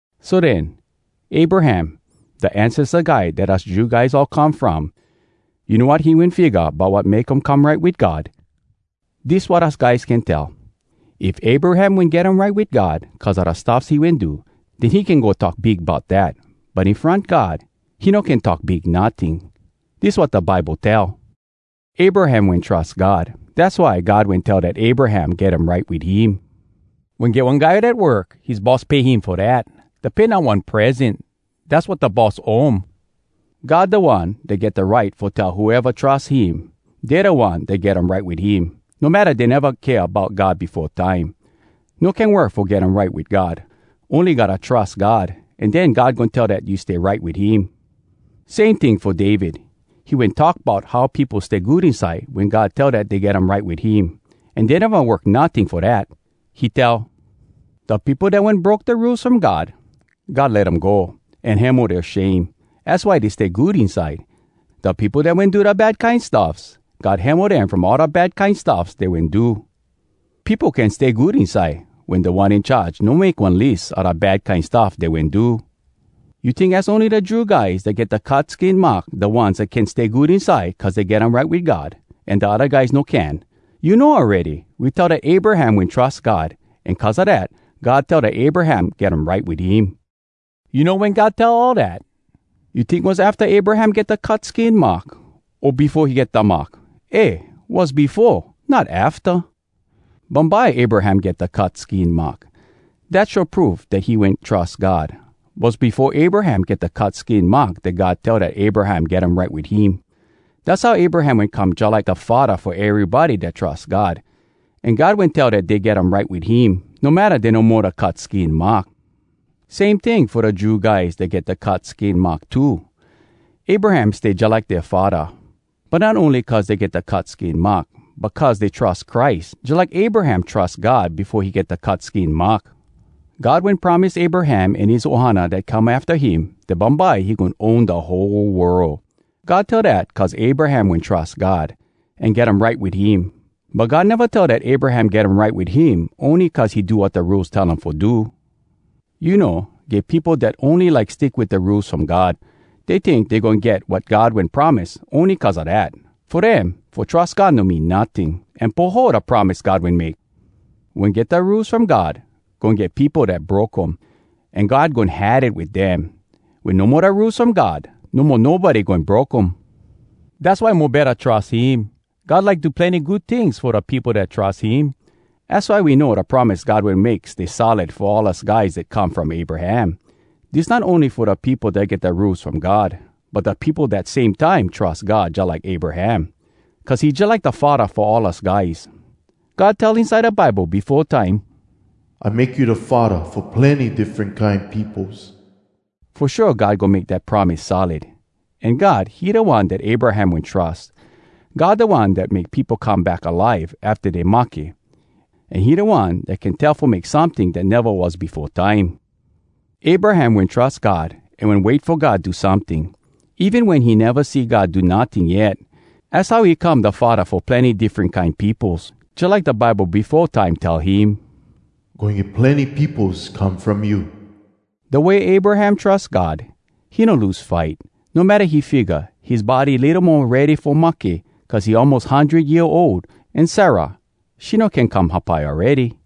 So den, Abraham, da ancesta guy dat us Jew guys all come from, you know wat he wen figga bout wat make um come right wit God? Dis wat us guys can tell: If Abraham wen get um right wit God cuz a da stuffs he wen do, den he can go talk big bout dat. But in front God, he no can talk big notting. Dis wat da Bible tell: “Abraham wen trus God, Dass why God wen tell dat Abraham get um right wit him.” Wen get one guy dat work, his boss pay him fo dat. Da pay not one present—dass wat da boss owe um. God da One dat get da right fo tell whoeva trus him, dey da one dat get um right wit him, no matta dey neva kea bout God befo time. No can work fo get um right wit God. Ony gotta trus God, an den God goin tell dat you stay right wit him. Same ting fo David. He wen talk bout how peopo stay good inside wen God tell dat dey get um right wit him, an dey neva work notting fo dat. He tell: “Da peopo dat wen broke da Rules From God, God let um go, An hemo dea shame. Az why dey stay good inside! Da peopo dat wen do da bad kine stuffs, God hemo dem from all da bad kine stuffs dey wen do. Peopo can stay good inside Wen Da One In Charge no make one lis A da bad kine stuff dey wen do.” You tink az ony da Jew guys dat get da cut skin mark da ones can stay good inside cuz dey get um right wit God, an da odda guys no can? You know awready, we tell dat Abraham wen trus God, an cuz a dat, God tell dat Abraham get um right wit him. You know wen God tell all dat? You tink was afta Abraham get da cut skin mark, o befo he get da mark? Eh, was befo, not afta! Bumbye Abraham get da cut skin mark. Dat show proof dat he wen trus God. Was befo Abraham get da cut skin mark dat God tell dat Abraham get um right wit him. Dass how Abraham wen come jalike da faddah fo erybody dat trus God, an God wen tell dey get um right wit him, no matta dey no mo da cut skin mark. Same ting fo da Jew guys dat get da cut skin mark too, Abraham stay jalike dea faddah. But not ony cuz dey get da cut skin mark, but cuz dey trus Christ jalike Abraham trus God befo he get da cut skin mark. God wen promise Abraham an his ohana dat come afta him, dat bumbye he goin own da whole world. God tell dat cuz Abraham wen trus God, an get um right wit him. But God neva tell dat Abraham get um right wit him ony cuz he do wat da Rules tell um fo do. You know, get peopo dat ony like stick wit da Rules From God. Dey tink dey goin get wat God wen promise ony cuz a dat. Fo dem, fo trus God no mean notting, an poho da promise God wen make. Wen get da Rules From God, goin get peopo dat broke um, an God goin had it wit dem. Wen no mo da Rules From God, no mo nobody goin broke um. Dass why mo betta trus him. God like do plenny good tings fo da peopo dat trus him. Az why we know da promise God wen make stay solid fo all us guys dat come from Abraham. Dis not ony fo da peopo dat get da Rules From God, but da peopo dat same time trus God jalike Abraham. Cuz he jalike da faddah fo all us guys. God tell inside da Bible befo time, “I make you da faddah fo plenny diffren kine peopos.” Fo shua God goin make dat promise solid, an God, he da One dat Abraham wen trus. God da One dat make peopo come back alive afta dey mahke. An he da One dat can tell fo make someting dat neva was befo time. Abraham wen trus God an wen wait fo God do someting, even wen he neva see God do notting yet. Az how he come da faddah fo plenny diffren kine peopos, jalike da Bible befo time tell him, “Goin get plenny peopos come from you.” Da way Abraham trus God, he no lose fight, no matta he figga, his body litto mo ready fo mahke, cuz he almos hundred year ol, an Sarah, she no can come hapai awready.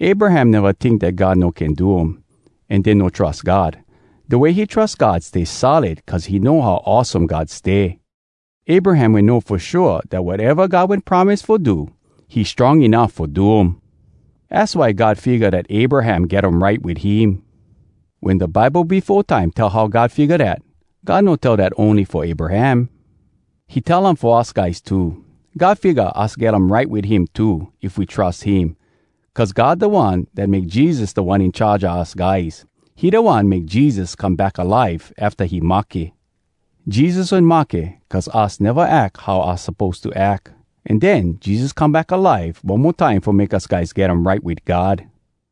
Abraham neva tink dat God no can do um, an den no trus God. Da way he trus God stay solid cuz he know how awesome God stay. Abraham wen know fo shua dat wateva God wen promise fo do, he strong enuff fo do um. Az why God figga dat Abraham get um right wit him. Wen da Bible befo time tell how God figga dat, God no tell dat ony fo Abraham. He tell um fo us guys too. God figga us get um right wit him too, if we trus him. Cuz God da One dat make Jesus Da One In Charge a us guys. He da One make Jesus come back alive afta he mahke. Jesus wen mahke cuz us neva ack how us suppose to ack. An den, Jesus come back alive one mo time fo make us guys get um right wit God.